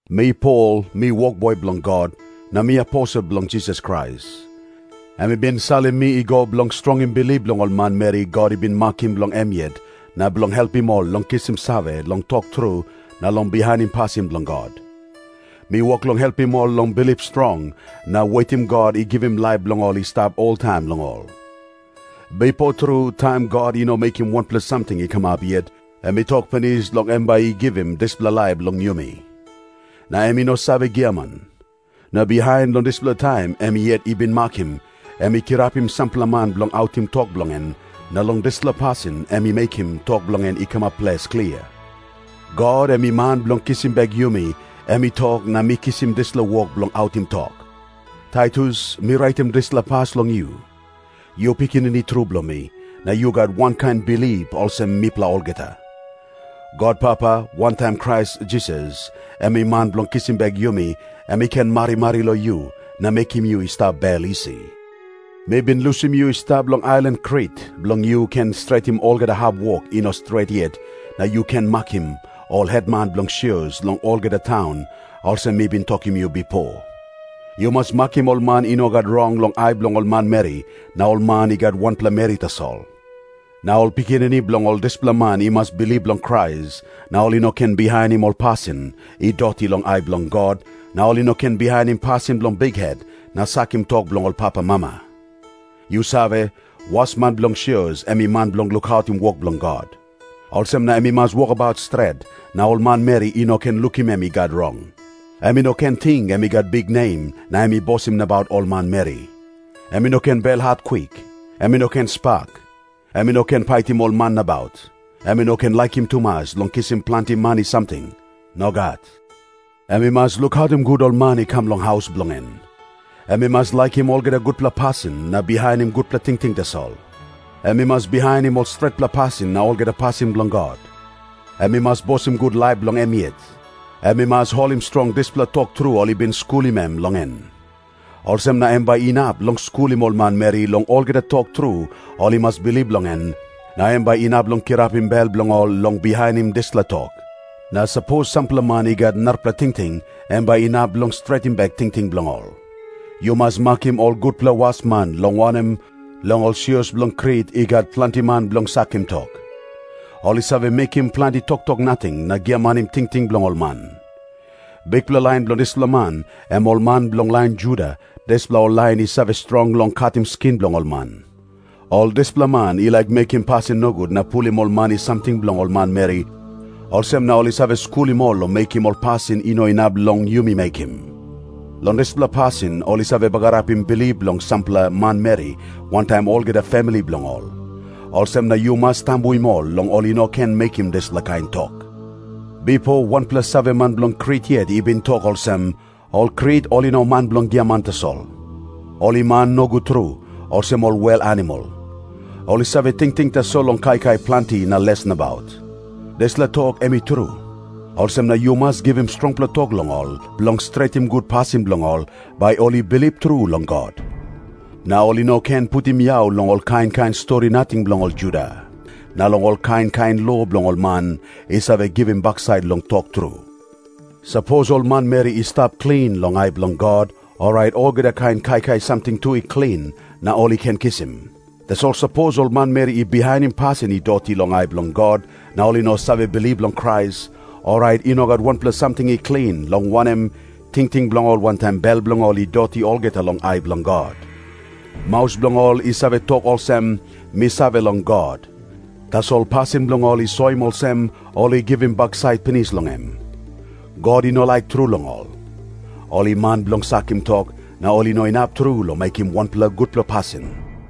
Mi Pol, mi wokboi bilong God, na mi aposel bilong Jisas Krais. Em i bin salim mi i go bilong strongim bilip bilong ol manmeri God i bin makim bilong em yet, na bilong helpim ol long kisim save long tok tru na long bihainim pasin bilong God. Mi wok long helpim ol long bilip strong na wetim God i givim laip bilong i stap oltaim long ol. Bipo tru, taim God i no mekim wanpela samting i kamap yet, em i tok pinis long em bai i givim dispela laip long yumi. Na em i no save giaman. Na bihain, long dispela taim em yet i bin makim, em i kirapim sampela man bilong autim tok bilong en, na long dispela pasin em i mekim tok bilong en i kamap ples klia. God, em i Man bilong kisim bek yumi, em i tok na mi kisim dispela wok bilong autim tok. Taitus, mi raitim dispela pas long yu. Yu pikinini tru bilong mi, na yu gat wankain bilip olsem mipela olgeta. God Papa, wantaim Krais Jisas, em i Man bilong kisim bek yumi, em i ken marimari long yu na mekim yu i stap bel isi. Mi bin lusim yu i stap long ailan Krit, bilong yu ken stretim olgeta hap wok i no stret yet, na yu ken makim ol hetman bilong sios long olgeta taun, olsem mi bin tokim yu bipo. Yu mas makim ol man i no gat rong long ai bilong ol manmeri, na ol man i gat wanpela meri tasol. Na ol pikinini bilong ol dispela man i mas bilip long Krais, na ol i no ken bihainim ol pasin i doti long ai bilong God, na ol i no ken bihainim pasin bilong bikhet na sakim tok bilong papamama. Yu save, wasman bilong sios em i man bilong lukautim wok bilong God. Olsem na em i mas wokabaut stret, na ol manmeri i no ken lukim em i gat rong. Em i no ken ting em i gat biknem na em i bosim nabaut ol manmeri. Em i no ken belhat kwik. Em i no ken spak. Em i no ken paitim ol man nabaut. Em i no ken laikim tumas long kisim planti mani samting. Nogat. Em i mas lukautim gut ol man i kam long haus bilong en. Em i mas laikim olgeta gutpela pasin na bihainim gutpela tingting tasol. Em i mas bihainim ol stretpela pasin na olgeta pasin bilong God. Em i mas bosim gut laip bilong em yet. Em i mas holim strong dispela tok tru ol i bin skulim em long en. Olsem na em bai inap long skulim ol manmeri long olgeta tok tru ol i mas bilip long en, na em bai inap long kirapim bel bilong ol long bihainim dispela tok. Na sapos sampela man i gat narapela tingting, em bai inap long stretim bek tingting bilong ol. Yu mas makim ol gutpela wasman, long wanem, long ol sios bilong Krit i gat planti man bilong sakim tok. Ol i save mekim planti toktok nating na giamanim tingting bilong ol man. Bikpela lain bilong dispela man, em ol man bilong lain Juda, dispela ol lain i save strong long katim skin bilong ol man. Ol dispela man i laik mekim pasin nogut na pulim ol mani samting bilong ol manmeri, olsem na ol i save skulim ol long mekim ol pasin i no inap long yumi mekim. Long dispela pasin ol i save bagarapim bilip bilong sampela manmeri wantaim olgeta famili bilong ol. Olsem na yu mas tambuim ol long ol i no ken mekim dispela kain tok. Bipo wanpela saveman bilong Krit yet i bin tok olsem, “Ol Krit ol i man bilong giaman tasol. Ol i man nogut tru, olsem ol wel animal. Ol i save tingting tasol long kaikai planti na les nabaut.” Dispela tok em i tru. Olsem na yu mas givim strongpela tok long ol, bilong stretim gut pasin bilong ol, bai ol i bilip tru long God. Na ol i no ken putim yau long ol kain kain stori nating bilong ol Juda, na long ol kain kain lo bilong ol man i save givim baksait long tok tru. Sapos ol manmeri yet i stap klin long ai bilong God, orait olgeta kain kaikai samting tu i klin, na ol i ken kisim. Tasol sapos ol manmeri i bihainim pasin i doti long ai bilong God na ol i no save bilip long Krais, orait i no gat wanpela samting i klin, long wanem, tingting bilong ol wantaim bel bilong ol i doti olgeta long ai bilong God. Maus bilong ol i save tok olsem, “Mi save long God.” Tasol pasin bilong ol i soim olsem, ol i givim baksait pinis long em. God i no laik tru long ol. Ol i man bilong sakim tok, na ol i no inap tru long mekim wanpela gutpela pasin.